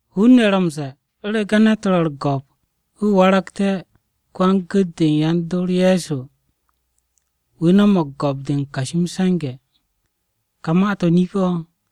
Hun-ne̱ ro̱ m-ze̱e̱, “U̱rege̱ ne̱t ro̱ u̱r-go̱p wu̱ waragte̱ ko-wan-gu̱t-de u̱n yan-dor Ye̱so, wu̱ no̱mo̱g go̱p-de u̱n kashi m-se̱nge̱.” Ka ma-to̱ nip-o̱.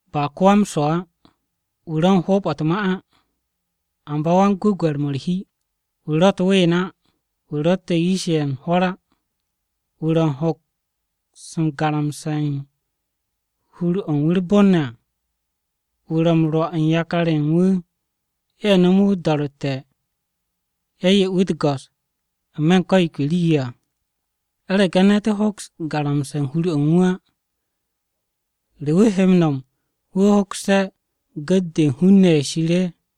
Ba ko-wa-m-swo̱ á, Wu̱ ro̱ u̱n hoob-o̱ u̱t-ma á, Amba yan-gwe̱gwe̱r-mo̱ u̱r-hi, Wu̱ ro̱ u̱t-ween á, Wu̱ ro̱tte̱ yish-ye̱ u̱n hwo̱r á, Wu̱ ro̱ u̱n hoks m-garamse̱ u̱n hur-o̱ u̱n wu̱ u̱r-bon ne̱ à, Wu̱ ro̱ m-rwo̱ u̱n yakar-ye̱ u̱n wu̱ ye̱ no̱mu̱ wu̱ o-do̱ro̱tte̱, ye̱ 'ye wu̱ u̱t-go̱s n-me̱ u̱n ko̱ yo ke rii-yo à. (U̱rege̱ ne̱t hoks m-garamse̱ hur-o̱ u̱n wu̱ á, ¿re wu̱ he m-nom wu̱ hokste̱ gu̱t-de u̱n hun-ne̱ ye̱ Shir?)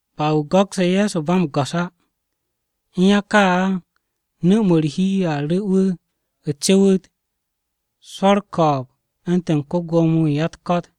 Ba wu̱ go̱kse̱ Ye̱so ba m-go̱s á. (U̱n ya ka á, nu̱-mo̱ u̱r-hi a ru̱ wu̱ cu̱wu̱t swo̱ u̱r-ko̱o̱b u̱ntu̱n ko-Gwo̱mo-wu̱ u̱n ya-u̱t-ko̱t.)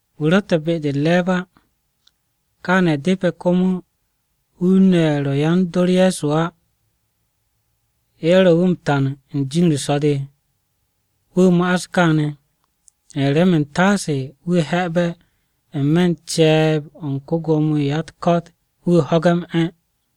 Wu̱ ro̱tte̱ be-de u̱t-re̱e̱b á. Kaane̱ depe̱ komo hun-ne̱ ye̱ ro̱ yan-dor Ye̱so á, ye̱ ro̱ wu̱ m-tan u̱n jin-u̱r so̱-de. Wu̱ ma'as kaane̱ remen u̱ntaase wu̱ he̱'e̱be̱ n-me̱ u̱n ce̱e̱b-o̱ u̱n ko-Gwo̱mo-wu̱ u̱n ya-u̱t-ko̱t, wu̱ ho̱ge̱ m-'e̱.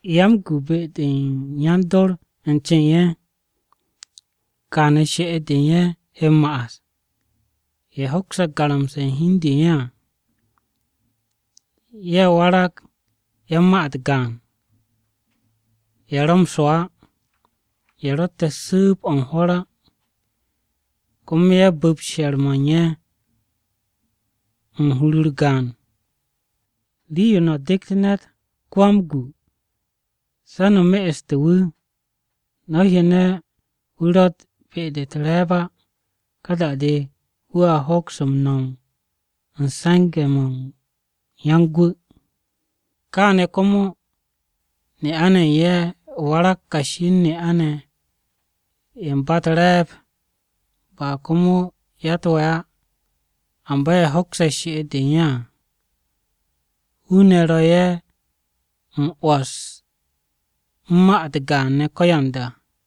Yan-m-se̱nge̱ be-de yan-dor u̱n ce u̱n ye̱, kaane̱ she'et-de u̱n ye̱ he m-ma'as: Ye̱ hokse̱ garamse̱ u̱n hi u̱n de u̱n ye̱ à. Ye̱ warag yan-ma-u̱t gaan. Ye̱ ro̱ m-swo̱ á. Ye̱ ro̱tte̱ su̱u̱b-o̱ u̱n hwo̱r á. Komo ye̱ bu̱p she̱r-mo̱ u̱n ye̱ u̱n hur-u̱r gaan. Rii-yo no̱ de̱gt ne̱t ko-wan-m-se̱nge̱ se̱ a me'este̱ wu̱, no̱ hyane̱ wu̱ ro̱tt be-de u̱t-re̱e̱b á, ka da-de wu̱a hoks m-no̱m u̱n se̱nge̱-mo̱ u̱n yan-m-se̱nge̱. Kaane̱ komo ne'a-ne̱ ye̱ u̱n ye̱ warag kashi u̱n ne'a-ne̱ ye̱ u̱n ba u̱r-re̱e̱b, ba komo ya-u̱t-we̱ á. Amba ye̱ hokse̱ she'et-de u̱n ye̱ à. Hun-ne̱ ro̱ ye̱ m-'wo̱s u̱n ma-u̱t gaan ne̱ ko̱yanda.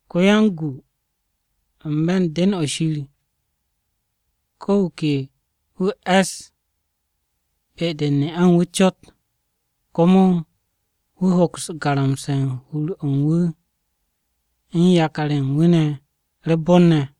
Ko-wan-m-se̱nge̱ n-me̱ u̱n den-o̱ Shir, ko̱ wu̱ ke wu̱ e̱s be-de u̱n ne'a u̱n wu̱ cot. Komo wu̱ hoks garamse̱ u̱n hur-o̱ u̱n wu̱ u̱n yakar-ye̱ u̱n wu̱ ne̱ u̱r-bon ne̱.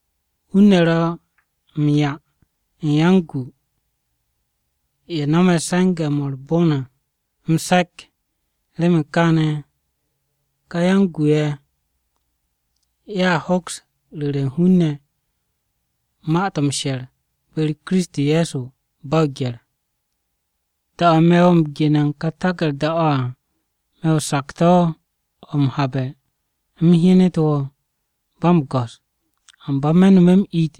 Hun-ne̱ ro̱ m-'ya u̱n yan-m-se̱nge̱-ye̱ no̱me̱ se̱nge̱-mo̱ u̱r-bon à m-se̱k. Remen kaane̱, ka yan-m-se̱nge̱-ye̱, ye̱a hoks ru̱re̱ u̱n hun-ne̱ ma-to̱ m-she̱r be-u̱r Kiristi Ye̱so, ba o-gye̱r. Da-o̱ me̱ wo̱ u̱n gene̱ u̱n kà taku̱rda-o̱ à, me̱ o-sakto̱ o̱ m-habe̱ u̱m hyenet wo̱ ba m-go̱s. Amba me̱ nome̱ m-it,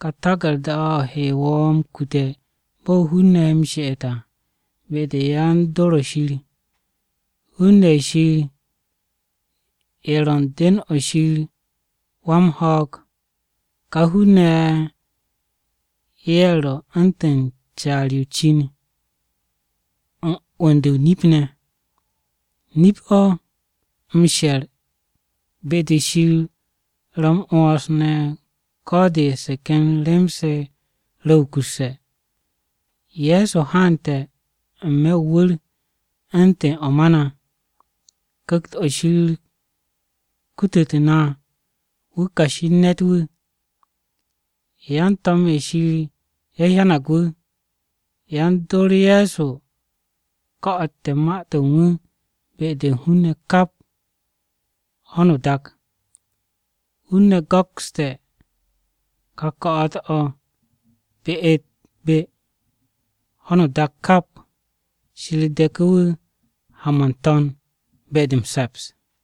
kà taku̱rda-o̱ he wo̱ m-kute̱ bo̱ hun-ne̱ he m-she'et à be-de yan-dor o-Shir. Hun-ne̱ ye̱ Shir ye̱ ro̱ u̱n den-o̱ Shir wan-ho̱o̱g à. Kà hun-ne̱ ye̱, ye̱ ro̱ u̱ntu̱n caar-yo o-cin u̱n 'wu̱n-de o-nip ne̱. Nip-o̱, m-she̱r be-de Shir ro̱ m-'wo̱ns ne̱ ko̱ de nomte̱ se ken rem-se ro̱ko̱n wukusse̱ à: Ye̱so haante̱ n-me̱ o-wu̱r u̱ntu̱n o̱ ma na, Ku̱kt-o̱ Shir kutute̱ na wu̱ kashi u̱n ne̱t-wu̱. Yan-to̱m-ye̱ Shir ye̱ hyanag wu̱. Yan-dor Ye̱so ko̱'o̱te̱ ma-to̱ u̱n wu̱ be-de hun-ne̱ kap ho̱no o-dak. Hun-ne̱ go̱kste̱ kà ko̱'o̱t-o̱ be-u̱t-be ho̱no o-dak kap. Shir de̱ku̱ wu̱ ha-m o̱ n-To̱n be-de m-se̱ps.